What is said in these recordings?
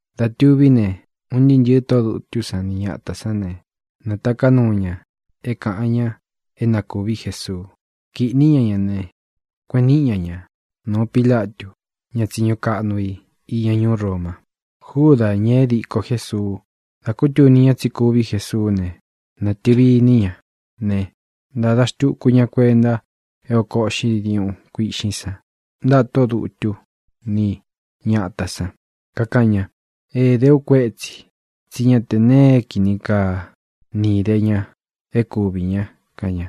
Dā tuví ne, un ntɨɨ́ ntɨ̄ɨ tóꞌō dutú san ni ñatā sán ne, nātaká nuu ña é kāꞌan ña é na kūví Jesuu. Kīꞌní ña ña ne, kueꞌen níꞌi ña ña nūu Pílatu, ña tsiñu kaꞌnu i iña ñuú Roma. Júdā, ña é diko Jésuu, dā kútuni ña tsí kuví Jesuú ne, nātɨvi iní ña ne, ntāda xtuku ña kuenta é ōko uꞌxí diuꞌun kuiꞌxín san ntaꞌa tóꞌō dutú ni ñatā san. Kakaꞌan ña: —Ēdé u kuétsī, tsí ña té nee é kini kaa ni īdé ña é kuvī ña —kaꞌan ña.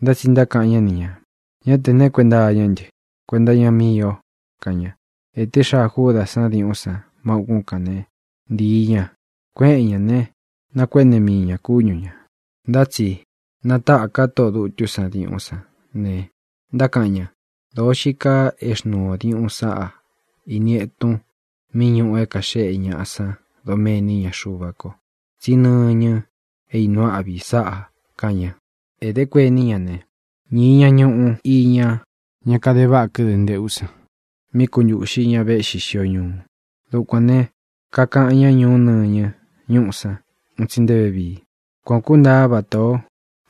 Ntá tsi ntákaꞌan ñá ni ñā: —Ñá tē neé kuenta iñá ntɨ. Kuenta iña míi ō —kaꞌan ña. Ēté xaa Júdā sán diuꞌún san má ūkún kān né, ntīi ña, kueꞌen ñá ne, nakuéꞌne mii ñā kúñu ñā. Ntá tsi nátaka tóꞌō dutú san diuꞌún san ne, ntákaꞌan ña: —Dōo xií kaa é xnūu o diuꞌun sáꞌa ini etun mí ñuꞌu é kāxéꞌe ñaꞌa san doméni iña Xuva ko, tsí nɨñɨ é īnuu áꞌvi sáꞌā —kaꞌan ña. Ēdé kuení ña ne, ñīi ña ñuꞌu iña ñá kade váꞌa kɨ́dɨ̄ nteꞌú san mí kuntūꞌxí ña véꞌxi xio ñuu. Dukuān ne, kakaꞌan ñá Ñuꞌú Nɨñɨ ñuꞌú san un tsi nté vevii. Kuan ō kúntaa vata ō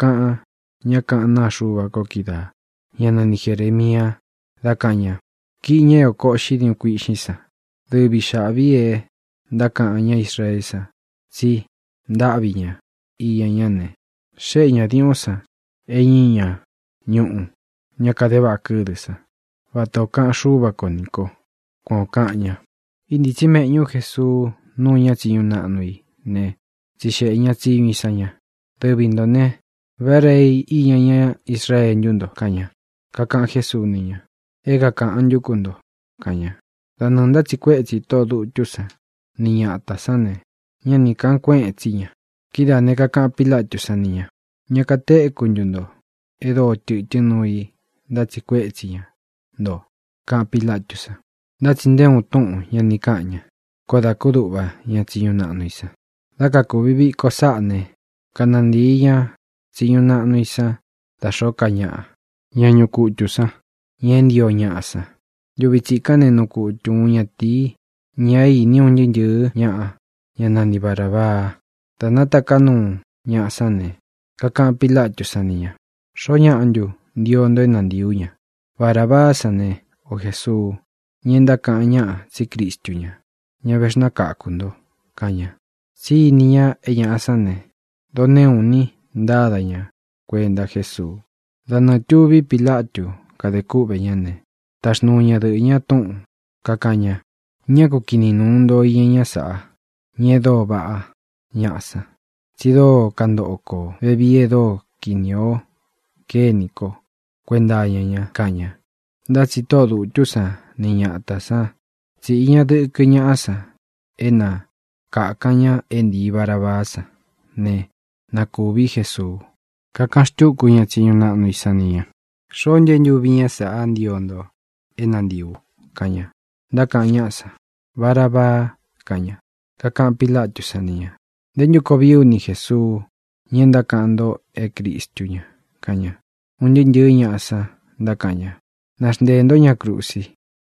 kaꞌan ñá kaꞌán naa Xuva ko kídaā, ñá nani Jerēmia, dá kāꞌan ña: “Kīꞌi ña é oko uꞌxí diuꞌun kuiꞌxín san, (dɨvi xāꞌví e ntákaꞌan ña Israeé san tsi ntáꞌvi ña iña ñá ne), xéꞌe ñā diuꞌún san é ñīi ña ñuꞌu ña kade váꞌa kɨ́dɨ̄ sán, vata ō kaꞌan Xúva ko nī ko.” Kuan ō kaꞌan ña. Íntītsí meꞌñu Jesuu núu ña tsiñu naꞌnu i ne, tsixeꞌe ña tsiñu i san ña: —Dɨvi ntō ne, ¿vá Rei iña ñá Israee ntú nto? —kaꞌan ña. Kakaꞌan Jésuu ni ña: —É kākaꞌan ntú ku nto —kaꞌan ña. Da nɨɨ̄ ntátsiꞌi kuetsi tóꞌō dutú san ni ñatā san ñá ne, ñá ni kāꞌan kuéꞌen tsi ña. Kidáā ne, kakaꞌan Pílatú san ni ñā: —¿Ña katéku ntu nto e dóo tɨtɨ́n nuu i ntátsiꞌi kuetsi ña nto? —kaꞌan Pílatú san. Ntá tsi nté uun túꞌūn ña ni káꞌan ña. Koó dā kúduꞌva ña tsiñu naꞌnu i san. Dá kakuvi viko sāꞌá ne, kanantíi ña tsiñu naꞌnu i san da xōó ka ñaꞌa, ña ñuꞌu kutu san, ña é ntio ñaꞌa san. Ntuvi tsikán ne, nuu kutu uun ñatīi, ña é īní un ntɨɨ́ ntɨ̄ɨ́ ñaꞌa, ñá nani Barābaa. Dā nátaká nuu ñaꞌa sán ne, kakaꞌan Pílatú san ni ñā: —¿Xoó ñaꞌa ntu ntio nto é nantīi ú ña: Barabaá san ne, o Jēsuu, ña e ntákaꞌan ñáꞌa tsí Cristu ñá, ña vexnákakū nto? —kaꞌan ña. Tsí ini ña é ñaꞌa sán ne, doneꞌu ini ntáda ña kuenta Jésuu. Da nɨɨ̄ tuví Pilatu kádē kúꞌvē ñá ne, taxnuu ñadɨꞌɨ̄ ña túꞌūn, kakaꞌan ña: “Ñá ku kiꞌnin nūun iña ñá saꞌa, ña e dóo vaꞌá ñaꞌa san, tsi dóo kantoꞌo kó vevii e dóo kinī o kénī kó kuenta iña ña”, kaꞌan ña. Ntá tsi tóꞌō dutú san ni ñatā san tsíꞌi ña dɨkɨ ñaꞌa san é na kākan ña é ntīi Barabaá san ne, na kūví Jesuu. Kakaꞌan xtúku ña tsiñu naꞌnu i san ni ñā: —¿Xoó ntu é ntuvi ñá saꞌá ntio nto é nantīi u? —kaꞌan ña. Ntákaꞌan ñáꞌa san: —¡Barabaa! —kaꞌan ña. Kakaꞌan Pílatú san ni ñā: —¿Nté ntu koo vií u ni Jēsuu, ña é ntákaꞌan nto é Cristu ña? —kaꞌan ña. Un ntɨɨ́ ntɨ̄ɨ́ ñaꞌa san ntákaꞌan ña: —¡Naxnteē ntó ña krusi!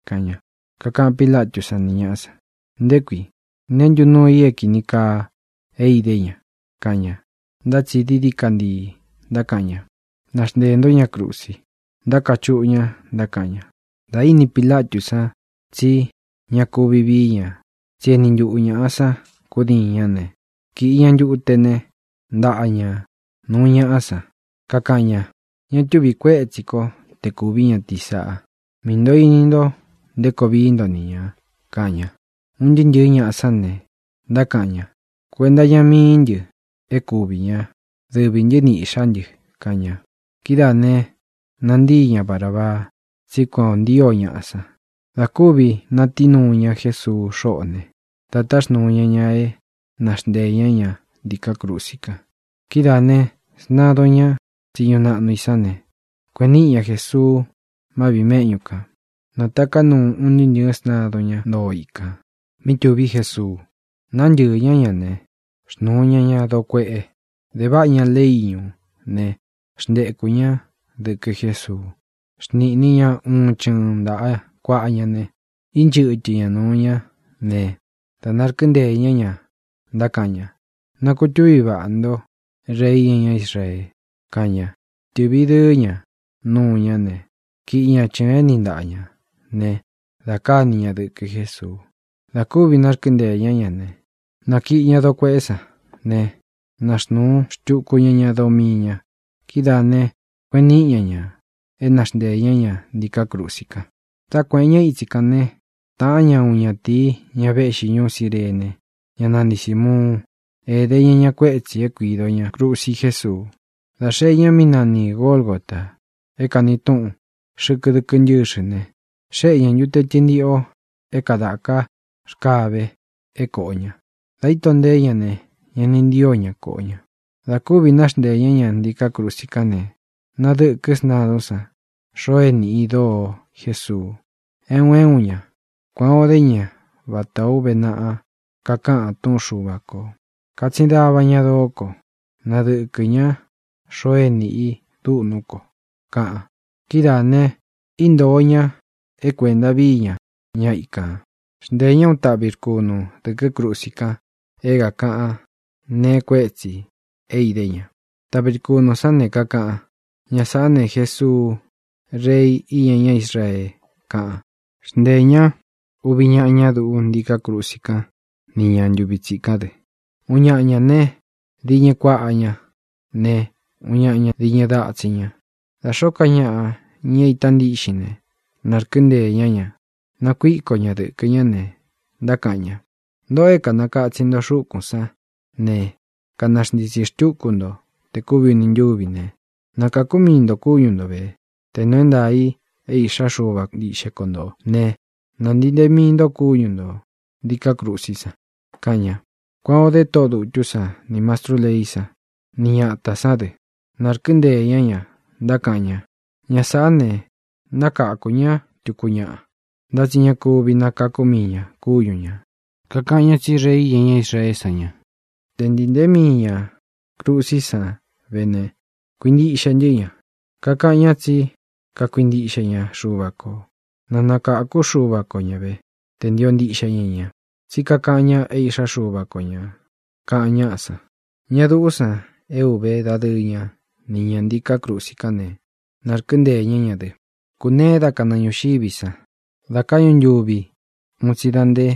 —kaꞌan ña. Kakaꞌan Pílatú san ni ñāꞌa san: —¿Nté kui? ¿Neé ntu nuu i é kīni kaa é idé ña? —kaꞌan ña. Ntá tsi dií dií ka ntii ntákaꞌan ña: —¡Naxnteē ntó ña krusi! —ntákachuꞌu ña, ntákaꞌan ña. Dā íni Pilatú san tsí ña kuvi vií ña, tsí e éni ntuꞌu ñāꞌa san kudiin ñá ne, kīꞌi ña ntute né, ntaꞌa ñā nuu ñaꞌá san. Kakaꞌan ña: —Ña túvi kuētsí ko te kūví ñatīí sāꞌa. Mii nto ini nto nté koo vií nto ni ñā —kaꞌan ña. Un ntɨɨ́ ntɨ̄ɨ́ ñaꞌa sán ne, ntákaꞌan ña: —Kuenta iña míi ntɨ é kuvī ñá, dɨvī ntɨ́ ni īꞌxá ntɨ —kaꞌan ña. Kidáā ne, nantii ña Barābaa, tsí kuan ō ntío ñaꞌa san. Dā kúvi natií nuu ña Jesuu xóꞌō ne, da táxnūu ña ña é naxnteē ñá ña ntiká krusi kan. Kidáā ne, sntadun ñá tsiñu naꞌnu i san ne, kueꞌen níꞌi ña Jēsuu má viꞌī méꞌñu kān. Nātaká nuu un ntɨɨ́ ntɨ̄ɨ́ sntadun, ñá ntoo ikān, mí tuví Jesuu. Nantɨ́ɨ̄ ñá ña ne, xnūu ña ña doo kueꞌe. Dēváꞌa ña leꞌé iñū né, xntekū ñá dɨkɨ Jésuu. Xniꞌnī ña uun chɨɨn ntaꞌa kuaꞌa ña ne, ínchɨtɨ ña nūu ñá ne, da narkɨ́nteē ñá ña, ntákaꞌan ña: —¡Na kutūví vaꞌā ntó, Rei iña ñá Israee! —kaꞌan ña. Tɨ̄ꞌvi dɨɨ́ ña nuu ñá ne, kīꞌí ña chɨ̄ɨn é niꞌi ntaꞌa ñā ne, da káni ña dɨkɨ Jésuu. Dā kúvi narkɨ́nteē ñá ña ne, nākiꞌi ña doo kueꞌé san ne, naxnūu xtuku ña ña doo mii ña. Kidáā ne, kueꞌen níꞌi ña ñā é naxnteē ñá ña ntiká krusi kan. Dá kuēꞌen ña ítsi kān né, tāꞌán ña uun ñatīi, ña véꞌxi ñuú Cirene, ñá nani Sīmuun. Ēde ña ña kuétsi é kuīdo ña krusi Jésuu. Dā xee ña mí nani Gōlgota, é kāni túꞌun Xɨkɨ Dɨkɨ́ Ntɨxɨ ne, xéꞌe ña ntute tɨntiꞌo é kādaká rkave é kōꞌo ña. Dā íto nteé ña ne, ña ni ntío ña koꞌo ña. Dā kúvi naxnteē ñá ña ntiká krusi kán ne, nādɨkɨ́ sntadún san xoo é nīꞌi i doo Jésuu, é un é un ña. Kuan ō dé ña vatā ó uve naꞌa kakaꞌan túꞌun Xuva kō: “Kātsin dava ña doó ko. Nadɨkɨ ña xoo é nīꞌi i dúꞌnú ko”, kaꞌan. Kidáā ne, íntōo ña é kuēnta víi ña ña ikān. Xnteē ñá uun taꞌvi rkunu dɨ̄kɨ́ krusi kan é kākaꞌan neé kuetsi é idé ña. Taꞌvi rkunū sán ne, kakaꞌan: “Ña sāꞌá ne, Jesuu, Rei iña ñá Israee”, kaꞌan. Xnteē ñá uvi ñaꞌa ña duꞌú ntiká krusi kán ni ñā ntuvi tsikán dɨ. Uun ñaꞌa ña ne, diñɨ kuaꞌa ña ne, uun ñaꞌa ña diñɨ datsin ña. Da xōó ka ñaꞌa, ña é īta ntíꞌxin ne, nārkɨ́nteē ñá ña, nakuíko ña dɨ̄kɨ ñá ne, ntákaꞌan ña: —Ntōꞌo é kānakatsin nto xúkūn sán ne kanaxntitsi xtúku nto té kuvi ūni ntuvi ne, ¡nakākú mii nto kúñu nto vē! Te nuu é ntaā i é Īꞌxá Xuva ntiꞌxe ko ntō né, ¡nāntii ntee mii nto kúñu ntō ntiká krusí san! —kaꞌan ña. Kuan ō dé tóꞌō dutú san, nī mastrú leí san, ni ñatā sán dɨ. Nārkɨ́nteē ñá ña, ntákaꞌan ña: —Ña sāꞌá ne, nakakū ñá tuku ñaꞌa, ntá tsi ña kuvi nakakú mii ñā kúñu ñā. Kakaꞌan ña tsí Rei iña ñá Israeé san ña. Te ntīi ntee mii ña krusí san ve ne, kuintiꞌxe ntɨ́ ña. Kakaꞌan ñá tsí kakuintiꞌxe ña Xuva kō. Na nakākú Xuva ko ña ve, tē ntio ntiꞌxe ña ña. Tsí kakaꞌan ña é Iꞌxá Xuva ko ñā —kaꞌan ñáꞌa san. Ña duꞌú san é uve dadɨɨ ña ni ñā ntiká krusi kán ne, nārkɨ́nteē ñá ña dɨ. Kūneé da kanɨɨ ñūxiví san da káꞌñu ntuvi un tsi da nté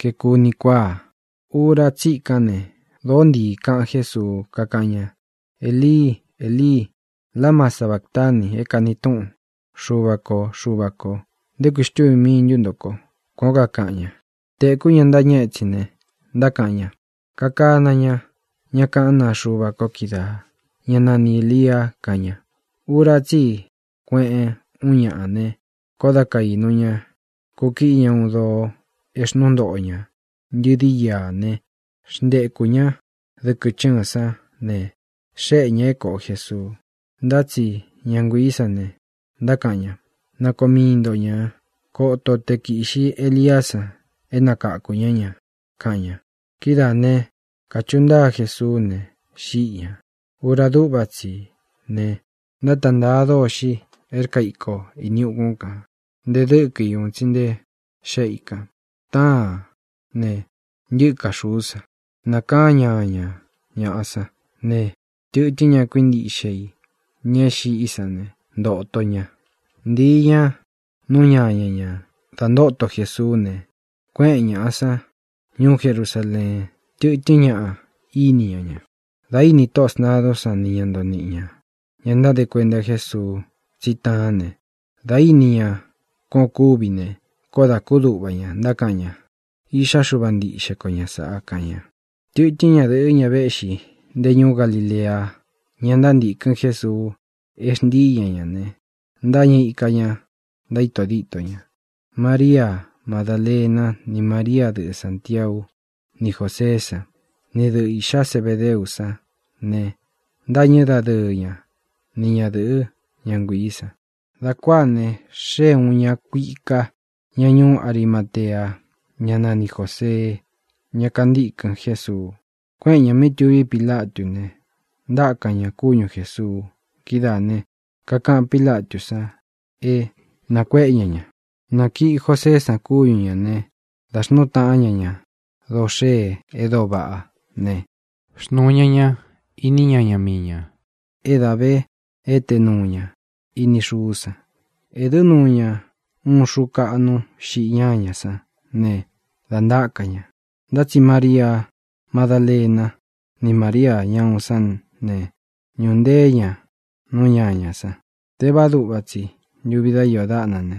kaeku uni kuáa. Ura tsikán ne, dōó ntii kaꞌan Jésuu, kakaꞌan ña: —Elii, Elii, ¿lama sabatani? (é kani túꞌun: Xuvā kó, Xuvā kó, ¿nté kuī xtúvī mii ntu ntó ko?) —kuan ō kaꞌan ña. Tēkú ña ntáñɨ étsin ne, ntákaꞌan ña: —Kakana ña ñá kaꞌán naa Xuva ko kídaā, ñá nani Ēlia —kaꞌan ña. Ura tsí i kueꞌen úun ñaꞌa ne, koó da kaīnu ña, kúkiꞌí ña uun doo é xnuu ntoꞌo ña ntɨdi íā né, xntekū ñá dɨkɨ chɨ́ɨn sán ne, xéꞌe ñā é kōꞌo Jesuu. Ntá tsi ña nguiī sán ne, ntákaꞌan ña: —Nakoo mii nto ñā. Koto o tē kiꞌxi Eliá san é nakakū ñá ña —kaꞌan ña. Kidáā ne, kachuꞌu ntáa Jesuú ne, xíꞌi ñā. Ura dúꞌva tsi í ne, ntáta ntāa dôxi é rkaa iko īni ukun kan, nte dɨ́kɨ í un tsi nte xéꞌe i kān. Táān ne, ntɨ́ka xūú san. Nakaan ñáña ñāꞌa sán ne, tɨtɨ́n ña kuíntiꞌxe i, ña é xiꞌi sán ne, ntōto ña. Ntīi ña nú ñaña ñā da ntóto Jesuú ne, kuéꞌen ñāꞌa san ñuú Jerusaleen. Tɨtɨ́n ñaꞌa íni ña ña. Dā íni tóꞌō sntadún san ni ña ntoo niꞌi ñā, ña ntáde Kuenta Jésuu, tsí taán ne, dā íni ña kuán ō kúvi ne, koó dā kúduꞌva ña. Ntákaꞌan ña: —Iꞌxá Xuva ntiꞌxe ko ña sāꞌa —kaꞌan ña. Tɨtɨ́n ñadɨ̄ꞌɨ́, ña véꞌxī nté ñūú Galilea, ñá ntántīkɨn Jésuu é xntii ña ñā ne, ntáñɨ ika ñā, ntaíto dítō ña. Maria Madálena ni María, dɨꞌɨ Sāntiau ni Jóseé san, ni dɨꞌɨ īꞌxá Zebedeú san ne, ntâñɨ́ dadɨɨ ña ni ñadɨ̄ꞌɨ, ñá nguiī san. Dā kuáā ne, xée ūun ña kuika, ña ñuú Arimatea, ñá nani Jōsee, ñá kantīkɨn Jésuu. Kuéꞌen ñā mí tuví Pilatú ne, ntákan ñā kúñu Jēsuu. Kidáā ne, kakaꞌan Pílatú san é nākuéꞌe ña ña. Nākiꞌi Joseé san kúñu ñā ne, dá xnuu taꞌán ña ña doo xee e dóo vaꞌá ne, xnuu ñá ña ini ñaña mii ñā é dā ve éte nuu ña ini xuú san. Ēdɨ́ nuu ñá uun xuu kaꞌnu xiꞌi ñáña sán ne, dā ntaka ña. Ntá tsi Maria Madálena ni Maria ñá uun sán ne, ñūꞌu nteé ña nú ñañā san. Tévāá duꞌva tsi ntuvi dá iō dáꞌna ne,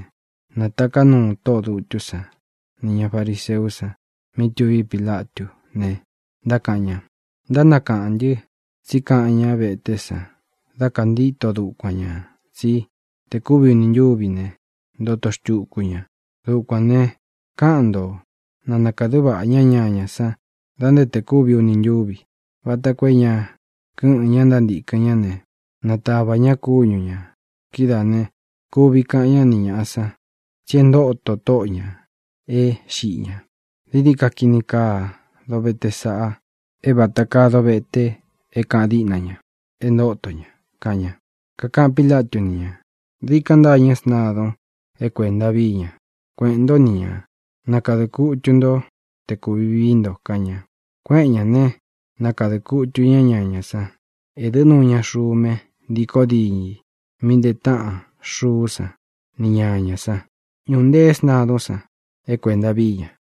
nātaká nuu tóꞌō dutú san nī ña fariseú san mí tuví Pilatú ne, ntákaꞌan ña: —Ntánakaꞌán ntɨ tsí kaꞌan ñá veté san dá kāntíto dukuan ñā tsí te kuvi uni ntúvi ne, ntoto xtuku ña. Dukuān ne, káꞌan nto na nākadɨ́ vaꞌā ñá ñañā san da nté tē kúvi uni ntúvi, vata koo é ña kɨ́ꞌɨ̄n ña ntántīkɨn ñá ne, natava ña kúñu ñā. Kidáā ne, kuvi kaꞌan ñá ni ñāꞌa san tsí e ntóto tóꞌo ñā é xiꞌi ña. Dií dií ka kini kaa dovete sáꞌa é vata kaa dovete é kāꞌan diꞌna ña é ntōto ña —kaꞌan ña. Kakaꞌan Pílatu ni ña: —Dikan ntâñɨ́ sntadun é kuēnta víi ña. Kueꞌēn ntó ni ña, nakadɨ̄ kutu ntó te kūvi vií nto —kaꞌan ña. Kuéꞌen ñā né, nakadɨ̄ kutu ñá ñañā san. Ēdɨ́ nuu ña xume ntíkō diñɨ i mí ntee táꞌan xuú san ni ñañā san. Ñūꞌu ntee sntadún san é kuēnta víi ña.